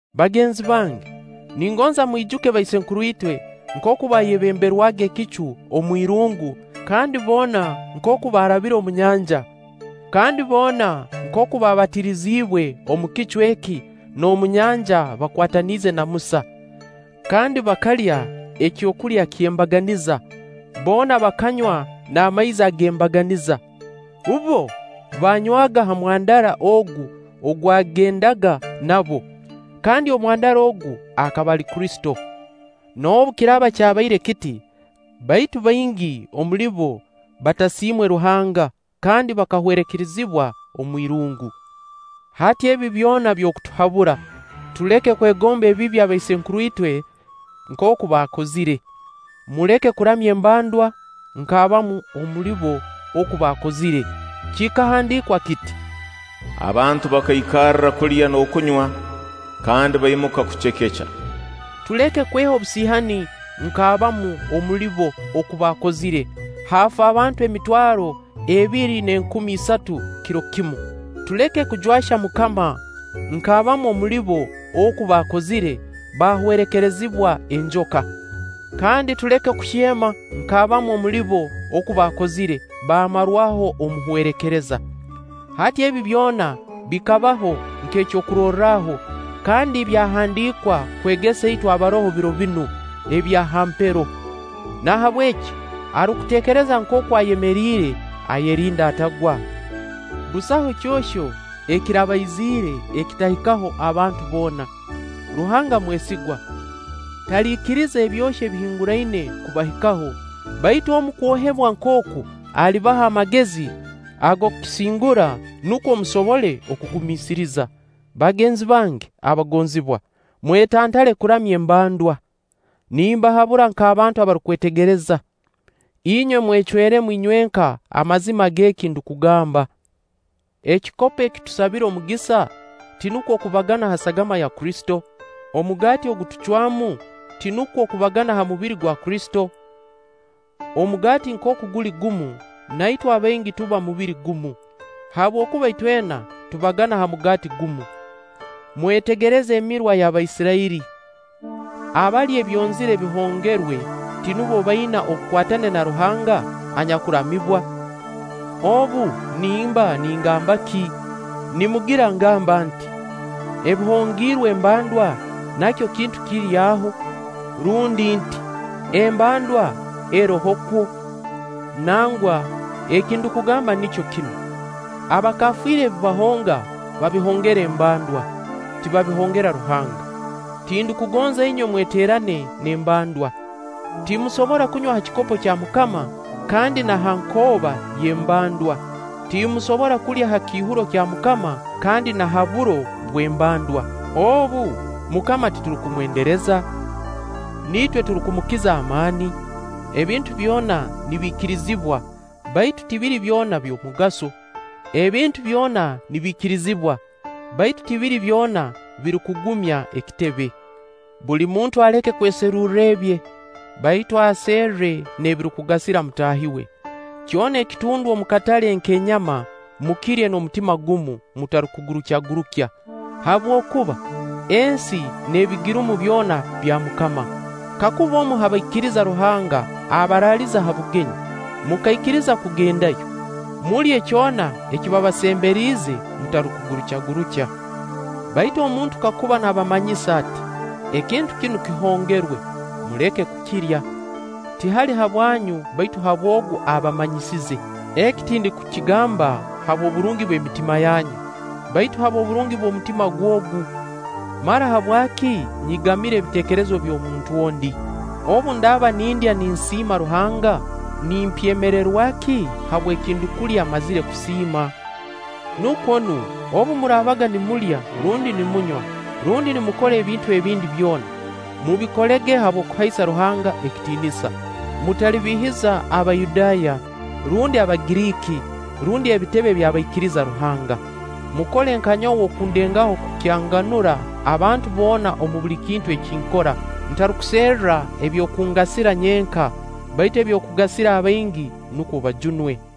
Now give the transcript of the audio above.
Bagenzi bange ningonza mwijuke baisenkuruitwe nkooku baayebemberwaga Ekicu omwirungu, kandi boona nkooku baarabire omu Nyanja, kandi boona nkooku baabatiriziibwe omu kicu eki n'omu Nyanja bakwataniize na Musa. Kandi bakalya ekyokulya ky'embaganiza boona bakanywa n'amaizi ag'embaganiza. Bbo baanywaga ha mwandara ogu ogwagendaga nabo, kandi Omwandara ogu akaba ali Kristo. Noobu kiraaba kyabaire kiti, baitu baingi omuli bo batasiimwe Ruhanga kandi bakahwerekerezibwa omwirungu. Hati ebi byona by'okutuhabura, tuleke kwegomba ebibi abaisenkuru itwe nkooku baakozire. Muleke kuramya embandwa nk'abamu omuli bo oku baakozire. Kikahandiikwa kiti: “Abantu bakaikarra kulya n'okunywa, kandi baimuka kucekeca.” tuleke kweha obusiihani nk'abamu omuli bo oku baakozire, haafa abantu emitwaro ebiri n'enkumi isatu kiro kimu. Tuleke kujwahya MUKAMA nk'abamu omuli bo oku baakozire, baahwerekerizibwa enjoka; kandi tuleke kuhyema nk'abamu omuli bo oku baakozire baamarwaho Omuhwerekereza. Hati ebi byona bikabaho nk'ekyokurorraho, kandi byahandiikwa kwegesa itwe abaroho biro binu ebya ha mpero. Nahabweki arukuteekereza nkooku ayemeriire, ayerinde atagwa. Busaho kyohyo ekirabaiziire ekitahikaho abantu boona. Ruhanga mwesigwa, taliikiriza ebyohyo ebibahinguraine kubahikaho, baitu omu kwohebwa nk'oku alibaha amagezi ag'okisingura nukwo musobole okugumiisiriza. Bagenzi bange abagonzibwa, mwetantale kuramya embandwa. Nimbahabura nk'abantu abarukwetegereza. Inywe mwecweremu inywenka amazima g'eki ndukugamba. Ekikopo eki tusabira omugisa, tinukwo okubagana ha sagama ya Kristo? Omugaati ogu tucwamu, tinukwo okubagana ha mubiri gwa Kristo? Omugaati nkooku guli gumu, na itwe abaingi tuba mubiri gumu, habwokuba itwena tubagana ha mugaati gumu. Mwetegereze emirwa y'Abaisirairi: abalya ebyonzira ebihongerwe, tinubo abaina obukwatane na Ruhanga anyakuramibwa? Obu, nimba ningamba ki? Nimugira ngamba nti: Ebihongiirwe embandwa nakyo kintu kiri aho? Rundi nti: Embandwa erohokwo? Nangwa, eki ndukugamba nikyo kinu: Abakafiiri ebi bahonga, babihongera embandwa, tibabihongera Ruhanga. Tindukugonza inywe mweteerane n'embandwa. Timusobora kunywa ha kikopo kya MUKAMA, kandi na ha nkooba y'embandwa. timusobora kulya ha kiihuro kya MUKAMA kandi na ha buro bw'embandwa. Obu, MUKAMA titurukumwendereza? Niitwe turukumukiza amaani? “Ebintu byona nibiikirizibwa”, baitu tibiri byona by'omugaso. “Ebintu byona nibiikirizibwa”, baitu tibiri byona birukugumya ekitebe. Buli muntu aleke kweserurra ebye, baitu aserre n'ebirukugasira mutaahi we. Kyona ekitundwa omu katale k'enyama mukirye n'omutima gumu, mutarukugurukyagurukya. Habwokuba: “ensi n'ebigirumu byona bya MUKAMA”. Kakuba omu ha baikiriza Ruhanga abaraaliza ha bugenyi, mukaikiriza kugendayo, mulye kyona eki babasemberiize mutarukugurukyagurukya. (Baitu omuntu kakuba naabamanyisa ati: “Ekintu kinu kihongerwe”, muleke kukirya, tihali habwanyu baitu habw'ogu abamanyisize. Eki tindukukigamba habw'oburungi bw'emitima yanyu, baitu habw'oburungi bw'omutima gw'ogu.) Mara habwaki nyigamira ebiteekerezo by'omuntu ondi? Obu ndaaba nindya ninsiima Ruhanga, nimpyemererwa ki habw'ekindukulya mmazire kusiima? Nukwo nu, obu muraabaga nimulya rundi ninumywa rundi nimukora ebintu ebindi byona, mubikolege habw'okuhaisa Ruhanga ekitiinisa. Mutalibiihiza Abayudaaya, rundi Abagiriiki, rundi ebitebe by'abaikiriza Ruhanga. Mukole nka nyowe oku ndengaho kukyanganura abantu boona omu buli kintu eki nkora, ntarukuserra eby'okungasira nyenka, baitu eby'okugasira abaingi nukwo bajunwe.